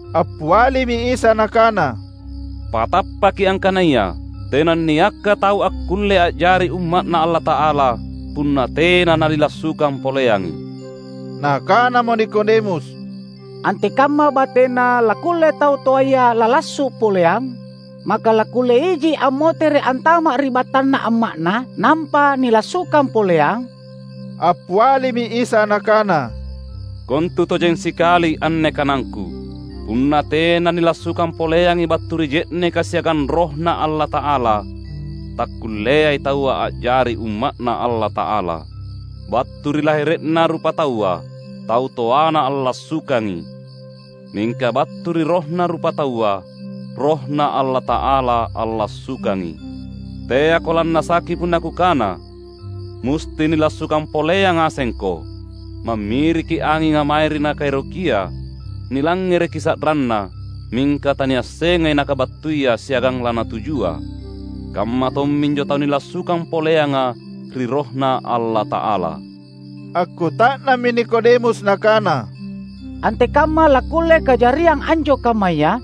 Appialimi Isa Nakana, "Patappaki angkanaya, tenanniakka tau akkulle a’jari umma’Na Allata’ala, punna tena nanilassukang poleangi." Nakanamo Nikodemus, "Antekamma batena lakkulle tau toaya lalassu’ poleang? Maka lakkulle iji ammotere’ antama’ ri battanna amma’na nampa nilassukang poleang?" Appialimi Isa Nakana, "Kontu tojeng sikali anne kanangKu: punna tena nilassukang poleangi battu ri je’neka siagang RohNa Allata’ala, takkulleai taua a’jari umma’Na Allata’ala. Battu ri lahere’na rupataua, tau toana allassukangi, mingka battu ri rohna rupataua, RohNa Allata’ala allassukangi. Teako lannasaki punna Kukana: musti nilassukang poleang ngasengko. Mammiriki anginga mange ri nakaerokia; nilangngereki sa’ranna, mingka taniassengai nakabattuia siagang lanatujua. Kamma tomminjo tau nilassukang poleanga ri RohNa Allata’ala." Akkuta’nammi Nikodemus nakana, "Antekamma lakkulle kajariang anjo kammaya?"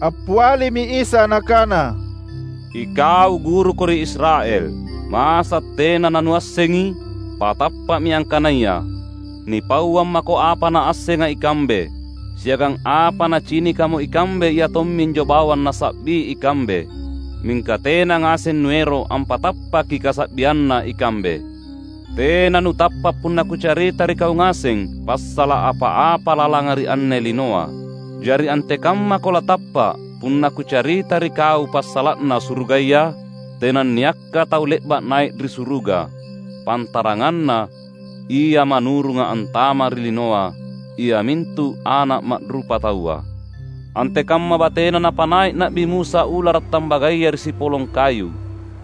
Appialimi Isa Nakana, "Ikau guruko ri Israel; masa’ tena nanuassengi? Patappa’mi angkanaya: nipauang mako apa naassenga ikambe; siagang apa nacinikamo ikambe iatomminjo bawang nasa’bi ikambe; mingka tena ngaseng nuero’ ampatappaki kasa’bianna ikambe. Tena nutappa’ punna Kucarita ri kau ngaseng passala’ apa-apa lalanga ri anne linoa; jari antekammako latappa’ punna Kucarita ri kau passala’na surugaya? Tenanniakka tau le’ba’ nai’ ri suruga, pantaranganna Ia manurunga antama’ ri linoa, iamintu Ana’ Ma’rupataua. Antekamma batena napanai’ Na’bi Musa ulara’ tambagaya ri sipolong kayu,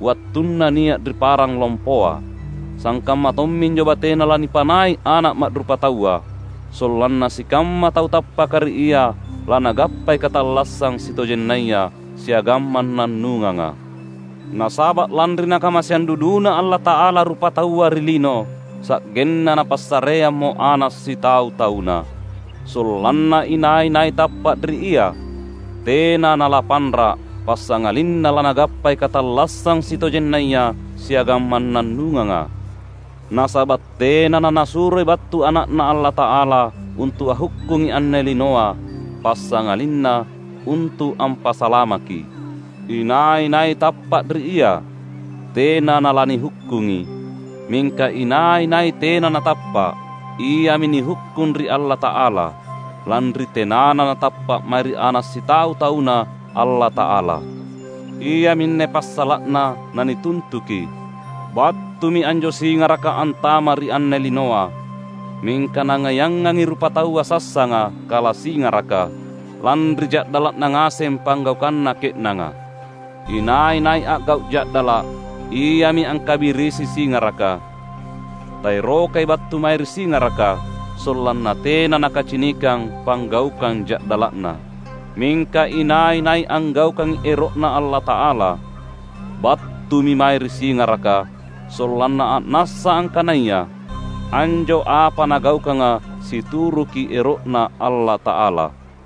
wattunna nia’ ri parang lompoa, sangkamma tomminjo batena lanipanai’ Ana’ Ma’rupataua; sollanna sikamma tau tappaka ri Ia lanagappai katallassang sitojennaya siagang mannannunganga." Nasaba’ lanri Nakamaseang duduna Allata’ala rupataua ri lino, sa’genna Napassareammo Ana’ sitau-tauNa, sollanna inai-nai tappa’ ri Ia tena nalapanra’, passangalinna lanagappai katallassang sitojennaya siagang mannannunganga. Nasaba’ tena naNasuroi battu Ana’Na Allata’ala untu’ anghukkungi anne linoa, passangalinna untu’ ampasalamaki. Inai-nai tappa’ ri Ia, tena nalanihukkungi. Mingka inai-nai tena natappa’, iami nihukkung ri Allata’ala, lanri tenana natappa’ mae ri Ana’ Sitau-tauNa Allata’ala. Iaminne passala’na nanituntuki: Battumi anjo singaraka antama’ ri anne linoa, mingka nangaiangangi rupataua sassanga kala singaraka, lanri ja’dala’na ngaseng panggaukanna ke’nanga. Inai-nai a’gau’ ja’dala’, iami angkabirisi Singaraka; taerokai battu mae ri singaraka, sollanna tena nakacinikang panggaukang ja’dala’na. Mingka inai-nai anggaukangi ero’Na Allata’ala, battumi mae ri singaraka sollanna a’nassa angkanaya anjo apa nagaukanga situruki ero’Na Allata’ala.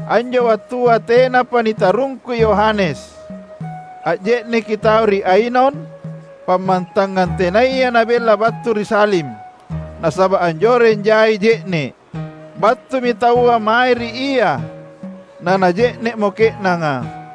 Anjo wattua tenapa nitarungkui Yohanes. Anje’neki tau ri Ainon, pammantangang tenaya nabella battu ri Salim, nasaba’ anjoreng jai je’ne’. Battumi taua mae ri ia, na naje’ne’mo ke’nanga.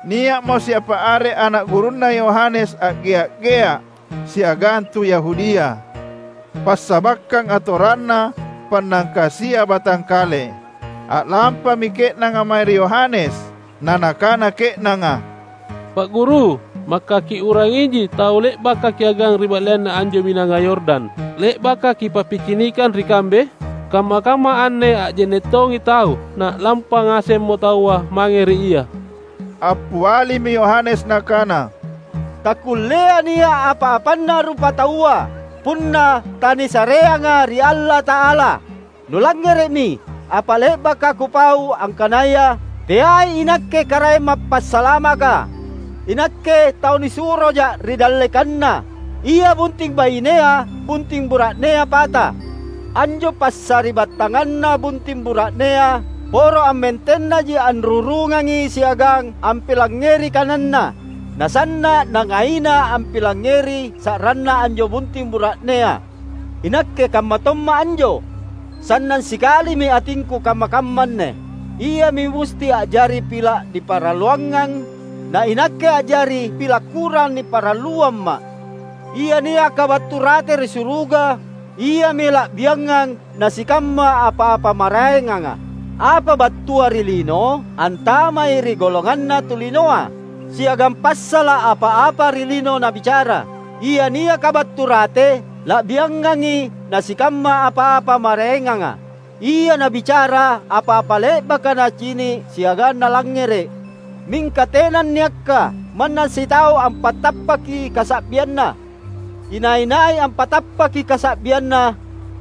Nia’mo siapa are ana’ gurunna Yohanes a’gea’-gea’ siagang tu Yahudia, passabakkang atoranna pannangkasia batangkale. A’lampami ke’nanga mae ri Yohanes, na nakana ke’nanga, "Pa’ Guru, maka kiu’rangi iji tau le’baka kiagang ri ba’leanna anjo Binanga Yordan, le’baka kipappicinikang ri kambe? Kamma-kamma anne anje’ne’ tongi tau, na’lampa ngasemmo taua mange ri Ia!" Appialimi Yohanes nakana, "Takkulleai nia’ apa-apanna rupataua, punna tanisareanga ri Allata’ala. Nulangngere’mi apa le’baka kupau angkanaya, ‘Teai inakke Karaeng Mappasalamaka. Inakke tau nisuroja’ ri dallekanNa.’ Ia bunting bainea, bunting bura’nea pata. Anjo passari’battanganna bunting bura’nea poro ammentennaji anrurungangi siagang ampilangngeri kananna; na sanna’ nangaina ampilangngeri sa’ranna anjo bunting bura’nea. Inakke kamma tomma’ anjo. Sannang sikalimi atingku kamma-kamma anne. Iami musti a’jari pila’ niparalluangang, na inakke a’jari pila’ kurang niparalluamma’." Ia niaka battu rate ri suruga, iami la’biangang na sikamma apa-apa maraenganga. Apa battua ri lino, antamai ri golonganna tu linoa, siagang passala’ apa-apa ri lino nabicara. Ia niaka battu rate la’biangangi na sikamma apa-apa maraenganga. Ia nabicara apa-apa le’baka Nacini’ siagang Nalangngere’, mingka tenanniakka manna sitau ampatappaki kasa’bianNa. Inai-nai ampatappaki kasa’bianNa,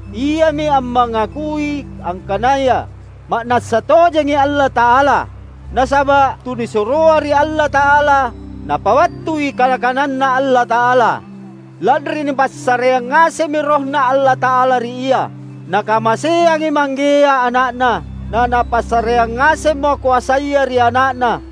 iami ammangakui angkanaya ma’nassa tojengi Allata’ala. Nasaba’ tunisuroa ri Allata’ala, Napabattui kana-kananNa Allata’ala, lanri nipassareang ngasemmi RohNa Allata’ala ri Ia. Nakamaseangi Manggea Ana’Na, na Napassareang ngasemmo koasaya ri Ana’Na.